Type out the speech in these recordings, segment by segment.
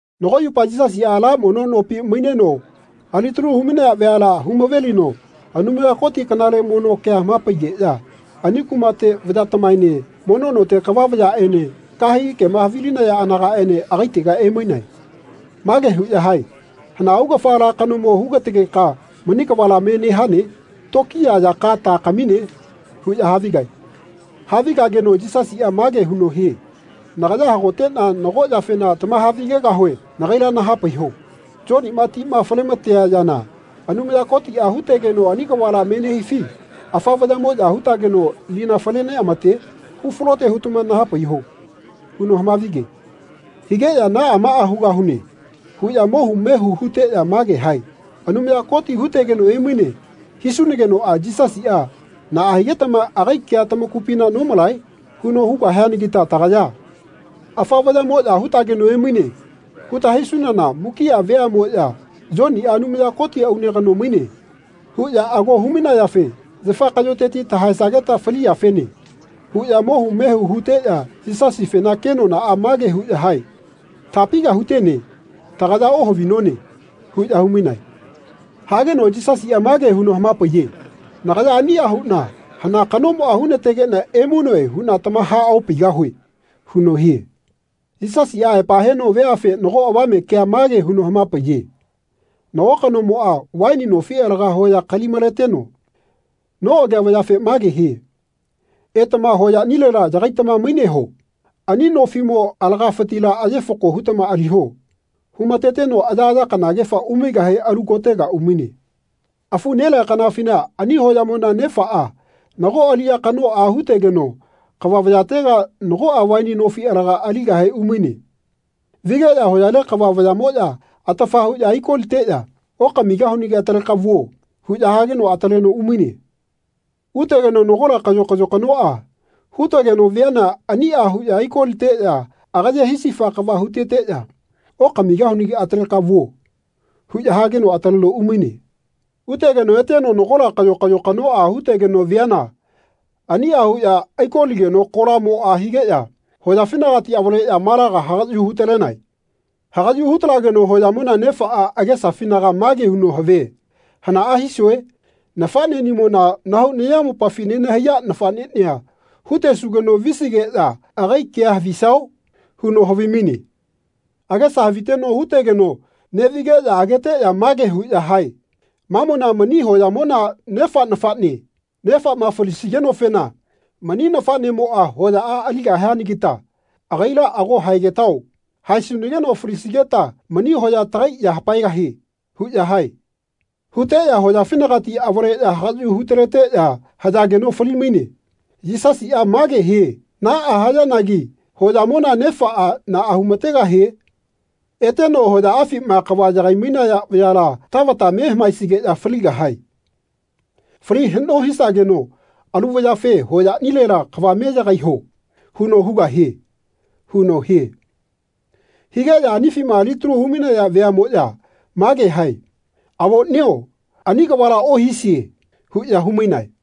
Nago yupa Yisasiꞌa ala mono nopi maineno alitalu humainaya vayala humavelino Anumaya Koti kanale mono kea hamapaigeꞌya ani kumate vayatamaene mono note kava vayaꞌene kahegi kema havilinaya anagaꞌene agaitega emainae. Mage huꞌya hae “Hana augafa ala kanomo hugategeka mani kavala me nehane? Tokiya yaka ta kamine?” huꞌya havigae. Havigageno Yisasiꞌa mage huno hie “Nagaya hagoteꞌna nago yafena tamahavigegahue nagaila nahapaiho. Yoniꞌma tima falematenea yana Anumaya Kotiꞌa hutegeno ani kavala me nehifi afa vayaꞌmoꞌya hutageno lina fale neꞌamate? Hufalote hutama nahapaiho.” huno hamavige. Higeꞌya “Naꞌa maꞌa hugahune.” huꞌya mohu mehu huteꞌya mage hae “Anumaya Koti hutegeno emaine.” hisunagenoꞌa Yisasiꞌa “Naꞌa higetama agai kea tamakupina nomalae?” huno hugahianagita tagaya “Afa vayaꞌmoꞌya hutageno emaine.” huta hisunana mukiꞌa veaꞌmoꞌya “Yoniꞌa Anumaya Koti aune kano maine.” huꞌya ago humainayafe “Yafa kaꞌyoteti tahaesageta faliyafene.” huꞌya mohu mehu huteꞌya Yisasifena kenonaꞌa mage huꞌya hae “Tapiga hutene? Tagaya ohavinone.” huꞌya humainae. Hageno Yisasiꞌa mage huno hamapaiye “Nagaya aniꞌa huꞌna hana kanomoꞌa hunategeꞌna emainoe huꞌna tamahaopaigahue.” huno hie. Yisasiꞌa aepa heno veafe nago avame kea mage huno hamapaiye nago kanomoꞌa vaini nofi alaga hoya kali-maleteno noꞌagea vayafe mage hie “Etama hoyaꞌnilela yagaitama maineho. Ani nofiꞌmo alagafitila aye fako hutama aliho.” humateteno ayaꞌaya kanagefa umaigahe alu kotega umaine. Afu nelea kanafina ani hoyamona nefaꞌa nago aliꞌya kanoꞌa hutegeno kava vayatega nagoꞌa vaini nofi alaga aligahe umaine. Vigeꞌya hoyale kava vayaꞌmoya atafa huꞌya aikoliteꞌya “Okamigahunagi ataleka vuo.” huꞌya hageno ataleno umaine. Utegeno nagola kayo kayo kanoꞌa hutegeno viana aniꞌa huꞌya aikoliteꞌya agaye hisifa kava huteteꞌya “Okamigahunagi ataleka vuo.” huꞌya hageno ataleno umaine. Utegeno eteno nagola kayo kayo kanoꞌa hutegeno viana aniꞌa huꞌya aikoligeno kolamoꞌa higeꞌya hoyafinagati avaleꞌya malaga hagaꞌyu hutalenae. Hagaꞌyu hutalageno hoyamona nefaꞌa agesafinaga mage huno havie “Hanaꞌa hisue? Nafaꞌneꞌnimona nahau nayamopafi nenahaiya nafaꞌneꞌnia hutesugeno visigeꞌya agai kea havisao?” huno havimaine. Agesa haviteno hutegeno neꞌvigeꞌya ageteꞌya mage huꞌya hae “Mamona mani hoyamona nefa nafaꞌne. Nefaꞌma falisigenofena mani nafaꞌnemoꞌa hoyaꞌa aligahianagita agaila ago haegetao. Haesunageno falisigeta mani hoya tagai ya hapaegahie.” huꞌya hae. Huteꞌya hoyafinagati avaleꞌya hagaꞌyu hutaleteꞌya hayageno fali-maine. Yisasiꞌa mage hie “Naꞌa hayanagi hoyamona nefaꞌa naꞌa humategahie? Eteno hoyaꞌafima kava yagai-mainaya vayala tavata me hamaesigeꞌya faligahae. Fali haꞌno hisageno alu vayafe ‘Hoyaꞌnilela kava me yagaiho.’ huno hugahie.” huno hie. Higeꞌya anifima alitalu humainaya veaꞌmoꞌya mage hae “Avoꞌnio ani kavala ohisie.” huꞌya humainae.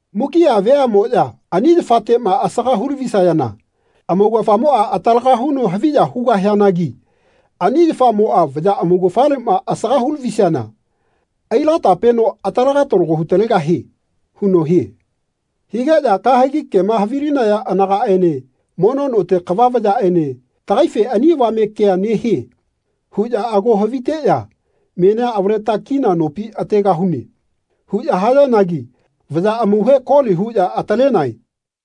Mukiꞌa veamoꞌya ani yafateꞌma asaga hulavisayana amaugafamoꞌa atalaga huno haviya hugahianagi ani yafamoꞌa vaya amaugafaleꞌma asaga hulavisiana ailatapeno aitalaga talago hutalegahie.” huno hie. Higeꞌya kahegi kema havilinaya anagaꞌene mono note kava vayaꞌene “Tagaife ani avame kea nehie.” huꞌya ago haviteꞌya “Menia avaleta kina nopi ategahune.” huꞌya hayanagi vaya amauhe koli huꞌya atalenae.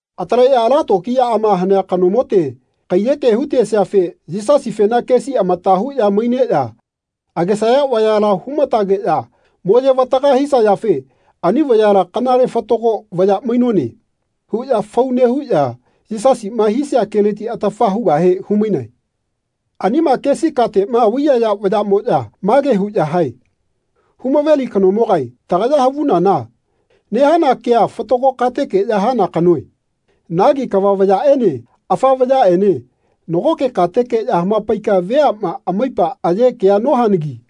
Ataleꞌya ala tokiyaꞌama hanea kanomote kaiyeke hutesiafe Yisasifena kesi amata huꞌya maineꞌya agesaya vayala humatageꞌya moyevataga hisayafe ani vayala “Kanale fatago vaya mainone.” huꞌya fau nehuꞌya Yisasiꞌma hisia keleti atafa hugahe humainae. Anima kesi kateꞌma vaiyaya vayaꞌmoꞌya mage huꞌya hae “Humaveli kanomogae tagaya havunana nehana kea fatago katekeꞌya hana kanoe. Nagi kava vayaꞌene afa vayaꞌene nagoke katekeꞌya hamapaika veaꞌma amaipa aye kea nohanagi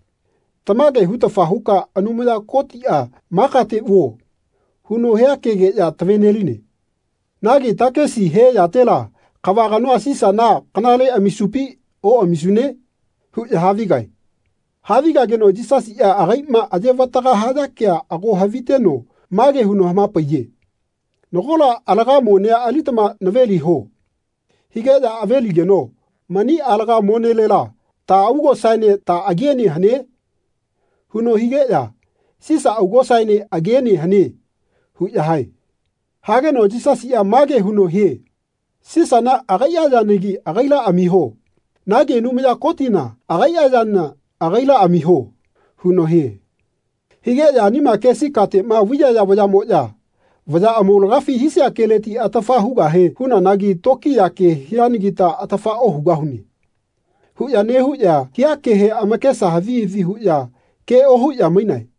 tamage hutafa huka Anumaya Kotiꞌa ‘Ma kate vuo.’ huno hia kegeꞌya taveneline. Nagi takisi he yatela kava kanoa Sisana kanale amisupi oꞌamisune?” huꞌya havigae. Havigageno Yisasiꞌa agaiꞌma ayevataga haya kea ago haviteno mage huno hamapaiye “Nagola alaga monea alitama naveliho.” higeꞌya aveligeno “Mani alaga monelela ta augosaene ta agiene hane?” huno higeꞌya “Sisa augosaene agiene hane.” huꞌya hae. Hageno Yisasiꞌa mage huno hie “Sisana agaiꞌa yanagi agaila amiho. Nagi Anumaya Kotina agaiꞌa yana agaila amiho.” huno hie. Higeꞌya anima kesi kateꞌma vaiyaya vayaꞌmoꞌya “Vaya amaulagafi hisia keleti atafa hugahe hunanagi tokiya ke hianagita atafa ohugahune.” huꞌya nehuꞌya hia kehe amakesa havi havi huꞌya ke ohuꞌya mainae.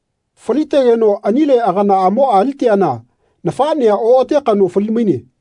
Falitegeno anile aganaꞌamoꞌa aliteana nafaꞌnea oꞌate kano falimaine.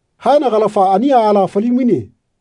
Haenagalafa ani aala falimaine.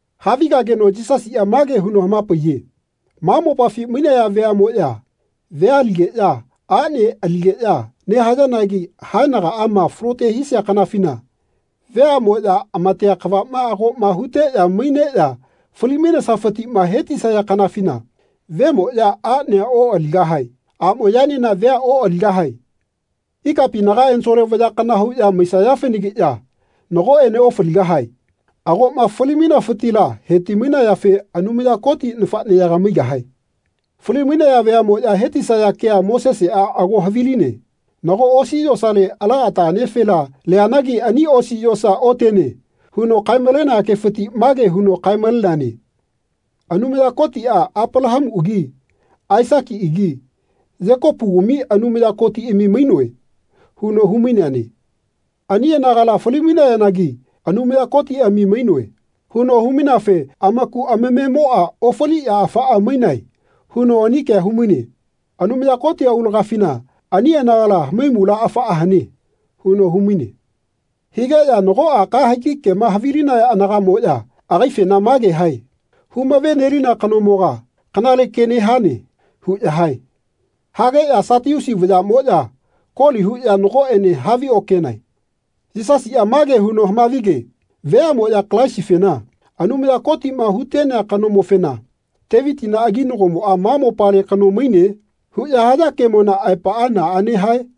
Havigageno Yisasiꞌa mage huno hamapaiye “Ma mopafi mainaya veaꞌmoꞌya vea aligeꞌya aꞌne aligeꞌya nehayanagi haenagaꞌama falote hisia kanafina veaꞌmoꞌya amatea kavama agoꞌma huteꞌya maineꞌya fali-mainesafitiꞌma hetisaya kanafina vemoꞌya aꞌnea oꞌaligahae. Aꞌmoꞌyaenena vea oꞌaligahae. Ikapinaga ensole vaya kana huꞌya maisayafenagiꞌya nagoꞌene ofaligahae. Agoꞌma fali-mainafitila heti-mainayafe Anumaya Koti nafaꞌneyaga maigahae. Fali-mainaya veaꞌmoꞌya hetisaya kea Moseseꞌa ago haviline. Nago osi yosale ala ata anefela leanagi ani osi yosa otene huno kae-malenea kefiti mage huno kae-maleneane ‘Anumaya Kotiꞌa Apalahamuꞌagi Aisakiꞌagi Yekopugami Anumaya Kotiꞌami mainoe.’ huno humaineane. Ani anagala fali-mainayanagi ‘Anumaya Kotiꞌami mainoe.’ huno humaineafe amaku amamemoꞌa ofaliꞌya afaꞌa mainae huno ani kea humaine. Anumaya Koti aulagafina ani anagala hamaimula afaꞌa hane.” huno humaine. Higeꞌya nagoꞌa kahegi kema havilinaya anagaꞌmoꞌya agaifena mage hae “Humaꞌvenelina kanomoga kanale ke nehane.” huꞌya hae. Hageꞌya Satiusi vayaꞌmoꞌya koli huꞌya nagoꞌene haviokenae. Yisasiꞌa mage huno hamavige “Veaꞌmoꞌya Kalaisifena, Anumaya Kotiꞌma huꞌtenea kanomofena, ‘Tevitina aginagomoꞌa ma mopale kano maine?’ huꞌya haya kemona aepaꞌa naꞌane hae?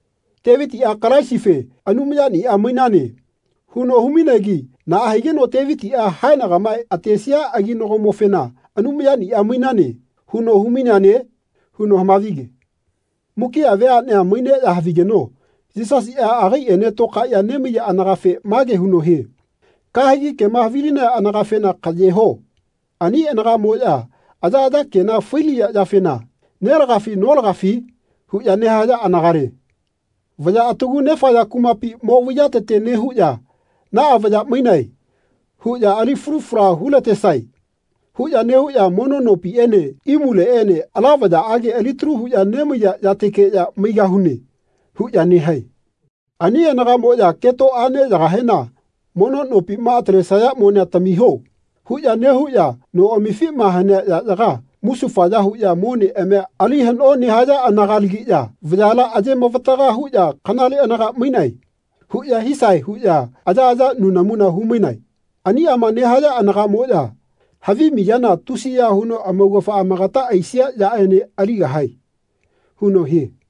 Tevitiꞌa Kalaisife ‘Anumayaniꞌa mainane.’ huno humainegi naꞌa higeno Tevitiꞌa haenagama atesia aginagomofena ‘Anumayaniꞌa mainane.’ huno humaineane?” huno hamavige. Mukiꞌa veaꞌnea maineꞌya havigeno Yisasiꞌa agaiꞌene tokaeꞌya nemaiya anagafe mage huno hie “Kahegi kema havilinaya anagafena kaꞌyeho. Ani anagaꞌmoꞌya ayaꞌaya kena failiya yafena ‘Nelagafi notagafi?’ huꞌya nehaya anagale. Vaya atagu nefaya kumapi mo vaiyatete nehuꞌya ‘Naꞌa vaya mainae huꞌya ali falu fala hulatesae.’ huꞌya nehuꞌya mono nopiꞌene imuleꞌene ‘Ala vayaꞌage alitalu huꞌya nemaiya yatekeꞌya maigahune.’ huꞌya nehae. Ani anagaꞌmoꞌya keto aꞌneyagahena ‘Mono nopima atalesaya monea tamiho.’ huꞌya nehuꞌya noꞌamifima hanea yaꞌyaga musufaya huꞌya moneꞌamia ali haꞌno nehaya anagalagiꞌya vayala ayemavataga huꞌya ‘Kanale anaga mainae.’ huꞌya hisae huꞌya ayaꞌaya nunamuna humainae. Aniꞌama nehaya anagaꞌmoꞌya havi miyana tusiya huno amaugafa amagata aisia yaꞌene aligahae.” huno hie.